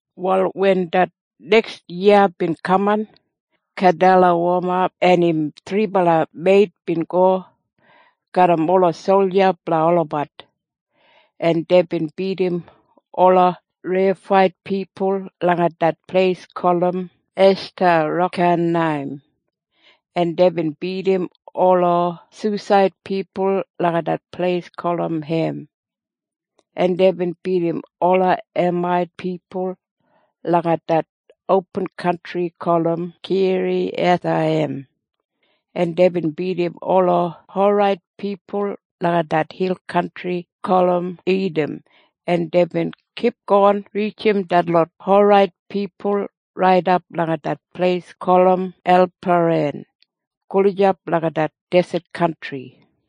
Wal wen det neks yiya bin kaman, Kedalawoma en im thribala meit bin go garram ola solja blanga olabat, en deibin bidim ola Reifait pipul langa det pleis gulum Eshtarokanaim, en deibin bidim ola Susait pipul langa det pleis gulum Hem, en deibin bidim ola Emait pipul langa det opin kantri gulum Kiriyathaiyim, en deibin bidim ola Horait pipul langa det hil kantri gulum Idam, en deibin kipgon rijim detlot Horait pipul raidap langa det pleis gulum Elparan gulijap langa det deset kantri.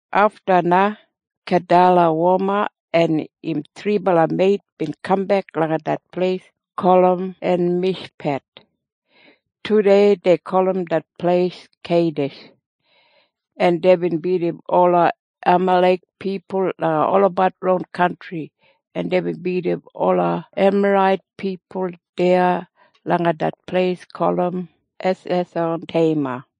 Afta na Kedalawoma en im thribala meit bin kambek langa det pleis gulum Enmishpet. Tudei dei gulum det pleis Keidish. En deibin bidim ola Amalek pipul langa olabat ron kantri, en deibin bidim ola Emarait pipul deya langa det pleis gulum Hesesonteima.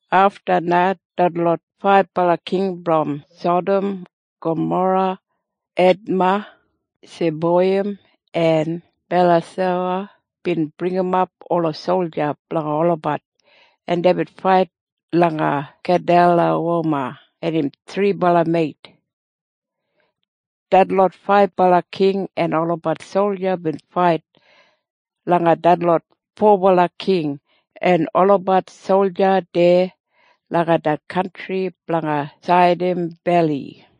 Afta na detlot faibala king brom Sadam, Gamora, Edma, Seboiyim en Belasowa bin bringimap ola solja blanga olabat, en deibin fait langa Kedalawoma en im thribala meit. Detlot faibala king en olabat solja bin fait langa detlot fobala king en olabat solja deya langa det kantri blanga Saidim Beli.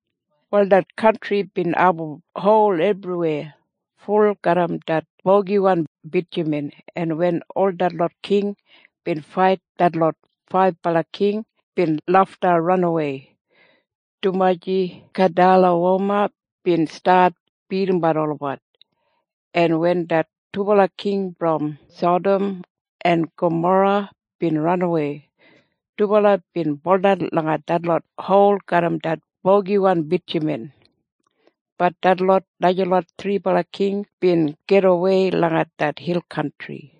Wal det kantri bin abum hol ebriweya ful garram det bogiwan bitjaman, en wen ol detlot king bin fait detlot faibala king bin lafta ranawei, dumaji Kedalawoma bin stat bidimbat olabat. En wen det dubala king brom Sadam en Gamora bin ranawei, dubala bin buldan langa detlot hol garram det bogiwan bitjaman. Bat detlot najalot thribala king bin gidawei langa det hil kantri.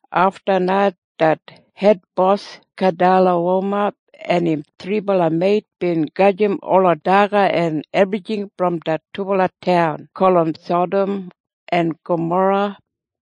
Afta na det hedbos Kedalawoma en im thribala meit bin gajim ola daga en ebrijing brom det dubala taun gulum Sadam en Gamora.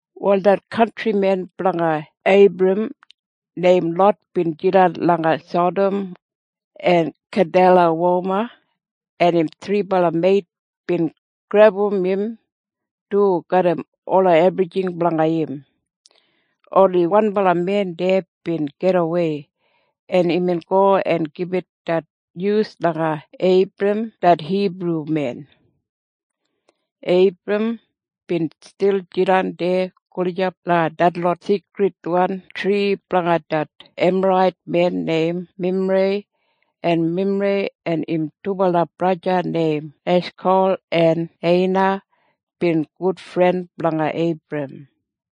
Wal det kantrimen blanga Eibram neim Lot bin jidan langa Sadam, en Kedalawoma en im thribala meit bin grebum im du garram ola ebrijing blanga im. Oni wanbala men deya bin gidawei, en imbin go en gibit det nyus langa Eibram det Hibrumen. Eibram bin stil jidan deya gulijap langa detlot seikridwan tri blanga det Emarait men neim Memrei, en Memrei en im dubala braja neim Eshkol en Eina bin gudfren blanga Eibram.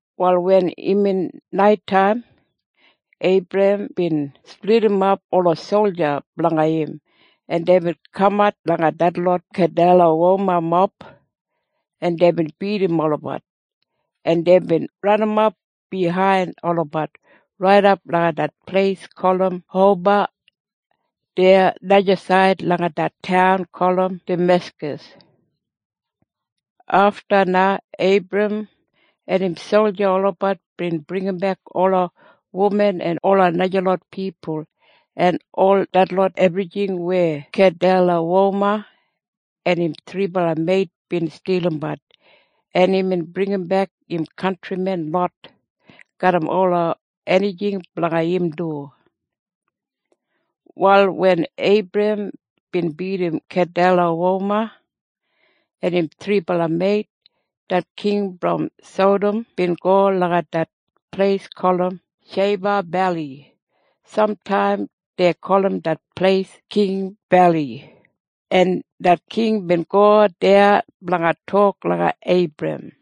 Wal wen imbin naitaim, Eibram bin splidimap ola solja blanga im, en deibin kamat langa detlot Kedalawomamob, en deibin bidim olabat, en deibin ranimap biyain olabat raidap langa det pleis gulum Hoba deya najasaid langa det taun gulum Dameskas. Afta na Eibram en im solja olabat bin bringimbek ola wuman en ola najalot pipul en ol detlot ebrijing weya Kedalawoma en im thribala meit bin stilimbat, en imbin bringimbek im kantrimen Lot garram ola enijing blanga im du. Wal wen Eibram bin bidim Kedalawoma en im thribala meit, det king brom Sadam bin go langa det pleis gulum Sheiba Beli. Samtaim dei gulum det pleis King Beli. En det king bin go deya blanga tok langa Eibram.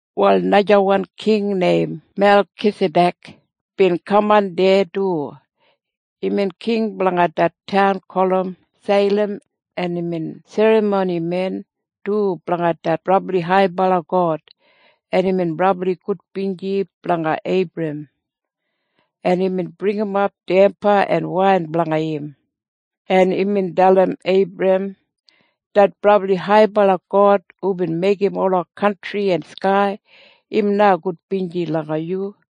Wal najawan king neim Melkisadek bin kaman deya du. Imbin king blanga det taun gulum Seilam, en imbin serramonimen du blanga det brabli haibala God. En imbin brabli gudbinji blanga Eibram, en imbin bringimap damba en wain blanga im, en imbin dalim Eibram, “Det brabli haibala God hubin meigim ola kantri en skai, im na gudbinji langa yu.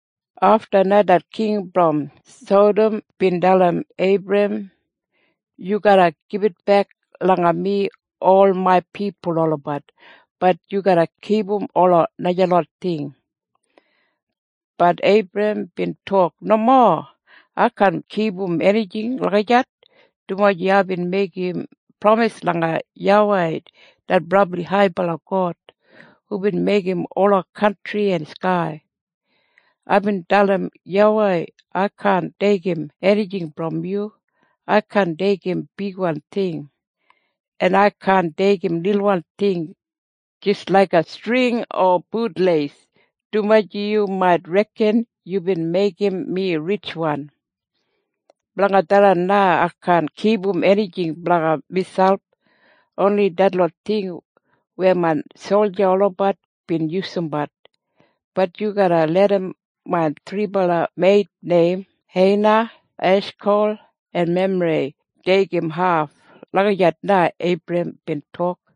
Afta na det king brom Sadam bin dalim Eibram, “Yu garra gibitbek langa mi ol main pipul olabat. Bat yu garra kipum ola najalot ting.” Bat Eibram bin tok, “Nomo. Ai kaan kipum enijing lagijat, dumaji aibin meigim pramis langa YAWEI det brabli haibala God hubin meigim ola kantri en skai. Aibin dalim YAWEI, ai kaan deigim enijing brom yu. Ai kaan deigim bigwan ting. En ai kaan deigim lilwan ting jis laiga string o butleis, dumaji yu mait reken yubin meigim mi ritjwan. Blanga tharran na ai kaan kipum enijing blanga miselp. Oni detlot ting weya main solja olabat bin yusumbat. Bat yu garra larram main thribala meit neim Eina, Eshkol en Memrei deigim haf.” Lagijat na Eibram bin tok.